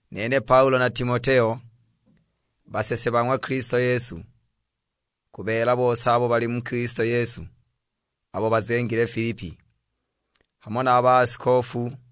Nene Paulo na Timoteo, basese ba ng'wa Kilisto Yesu: Ku beela bose abo bali muli Kilisto Yesu, abo bazengile Filipi; hamo na a baasikofu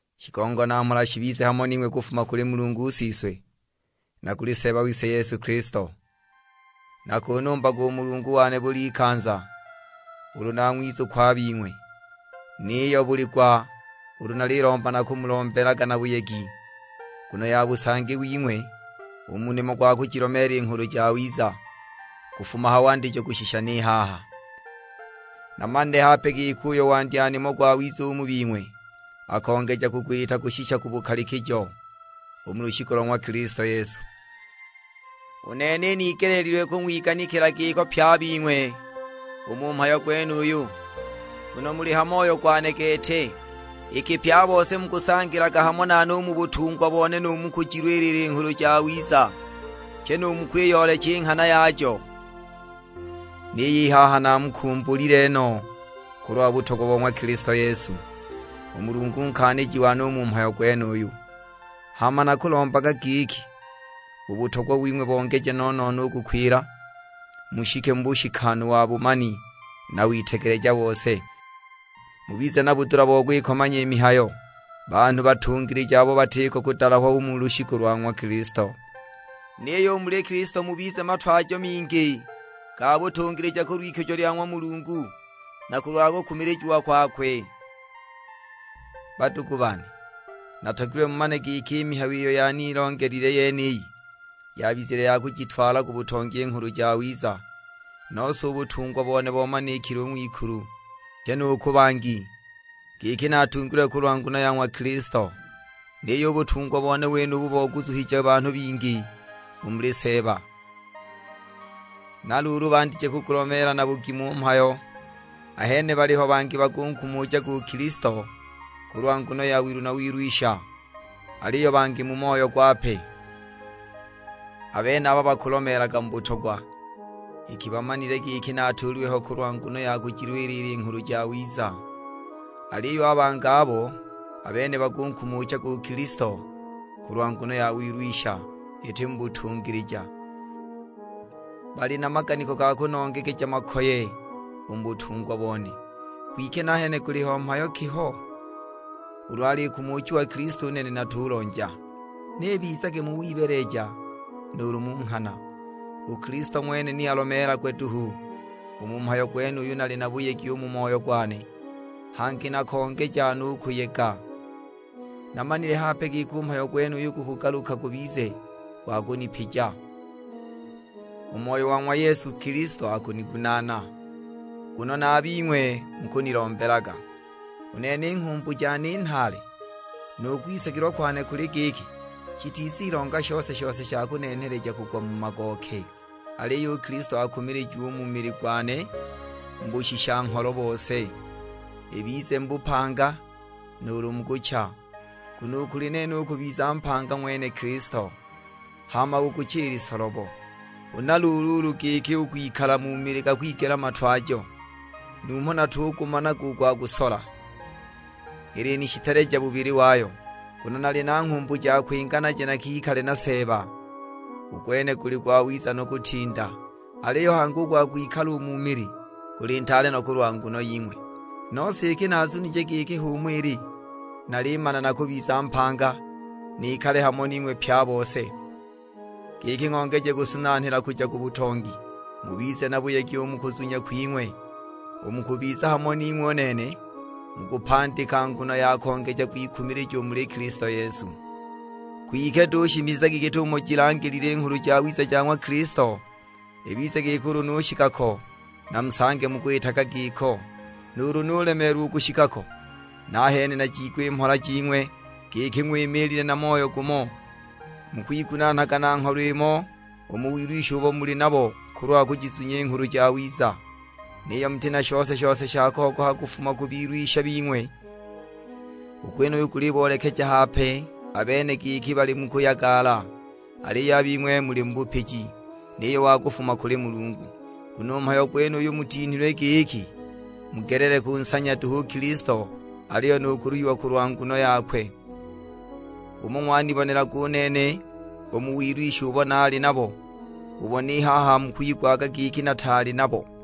Shigongo na mhola shibize hamo ning'we kufuma kuli Mulungu Siswe, na kuli Seeba wise Yesu Kilisto. Nakunumbaga u Mulungu wane bul'ikanza ulu nang'wizukwa a bing'we; niyo buli gwa ulu nalilomba nakumulombelaga na buyegi, nguno ya busangi wing'we, u mu nimo gwa kujilomeela i Nghulu Jawiza, kufuma ha wandijo kushisha ni haha. Namanile hape giki uyo wandya nimo gwawiza u mu bing'we akongeja kugwita kushisha ku bukalikijo, u mu lushiku lo ng'wa Kilisto Yesu. U nene inigeleelilwe kung'wiganikila giko pye a bing'we u mu mhayo gwenuyu, nguno muli ha moyo gwane gete; iki pye a bose mukusangilaga hamo nane u mu butungwa bone nu mu kujilwilila i Nghulu Jawiza, pyi nu mu kwiyoolecha i nghana yajo. Niyo i haha naamukumbulile no kulwa butogwa bo ng'wa Kilisto Yesu; u Mulungu nkaaniji wane u mu mhayo gwenuyu. Hama nakulombaga giki u butogwa wing'we bongeje no-no-no u kukwila, mushike mu bushikanu wa bumani na witegeleja bose. Mubize na budula bo kwikomanya i mihayo, banhu batungilija abo batiko kudalahwa u mu lushiku lwa ng'wa Kilisto. Niyo u muli Kilisto mubize na matwajo mingi ga butungilija kulw'ikujo lya ng'wa Mulungu, na kulwa kukumilijiwa kwakwe. Badugu bane, natogilwe mumane giki i mihayo iyo yanilongelile yeniyi, yabizile ya kujitwala ku butongi i Nghulu Jawiza. Nose u butungwa bone bomanikile u ng'wikulu, pyi nu ku bangi, giki natungilwe kulwa nguno ya ng'wa Kilisto. Niyo u butungwa bone wenubu boguzuhije banhu bingi u muli Seeba, na luulu bandije kugulomeela na bugimu u mhayo. Ahene baliho bangi bakunkumuchaga u Kilisto kulwa nguno ya wilu na wilwisha, aliyo bangi mu moyo gwape. A benaba bakulomeelaga mu butogwa, iki bamanile giki natuulilwe ho kulwa nguno ya kujilwilila i Nghulu Jawiza. Aliyo a bangi abo, a bene bakunkumuchaga u Kilisto kulwa nguno ya wilwisha, iti mu butungilija, bali na maganiko ga kunongegeja makoye u mu butungwa bone. Kwike nahene guliho mhayo ki ho? Ulu alikumuchiwa Kilisto u nene natulonja, ni ibizage mu wibeeleja nuulu mu nghana. U Kilisto ng'wene ni alomeelagwe duhu; u mu mhayo gwenuyu nali na buyegi u mu moyo gwane, hangi nakongeja no u kuyega. Namanile hape giki u mhayo gwenuyu gukugaluka gubize gwa kunipija; u Moyo wa ng'wa Yesu Kilisto akunigunaana, nguno na a bing'we mukunilombelaga. U nene i nghumbu jane i nhaale, nu kwisagilwa kwane kuli giki, shitizilonga shose-shose sha kunenheleja kugwa mu magooke. Aliyo u Kilisto akumilijiwe u mu mili gwane mu bushisha-ngholo bose: ibize mu bupanga, nuulu mu kucha. Nguno u kuli nene u kubiza mpanga ng'wene Kilisto, hama u kucha ili solobo. Huna luulu ulu giki u kwikala mu mili gakwigela matwajo, numho natugumanaga u gwa kusola. Ilinishiteleja bubili wayo, nguno nali na nghumbu ja kwinga naje nakikale na Seeba, u gwene guli gwawiza no kutinda. Aliyo hangi u gwa kwikala u mu mili, guli ntaale no kulwa nguno ying'we. Nose iki nazunije giki h'umo ili, nalimana nakubiza mpanga, nikale hamo ning'we pye a bose, giki ng'ongeje kusunanghila kuja ku butongi, mubize na buyegi u mu kuzunya kwing'we. U mu kubiza hamo ning'we u nene, mukupandika nguno ya kongeja kwikumilija u muli Kilisto Yesu. Kwike duhu shimizagi git'umo jilangilile Nghulu Jawiza ja ng'wa Kilisto. Ibize giki ulu nushika ko, namusange mukwitaga giko. Nuulu nulemeelwa u kushika ko, nahene najiigwe i mhola jing'we, giki ng'wimiilile na moyo gumo; mukwigunaanaga na ngholo imo u mu wilwisha ubo muli nabo kulwa kujizunya i Nghulu Jawiza. Niyo muti na shose-shose sha kogoha kufuma ku bilwisha bing'we. U gwenuyu guliboolekeja hape a bene giki bali mu kuyagala, aliyo a bing'we muli mu bupiji, niyo wa kufuma kuli Mulungu. Nguno u mhayo gwenuyu mutinhilwe giki mugelele kunsanya duhu u Kilisto, aliyo nu kuluhiwa kulwa nguno yakwe. H'umo ng'wanibonelaga u nene u mu wilwisha ubo naali nabo, ubo ni haha mukwigwaga giki nataali nabo.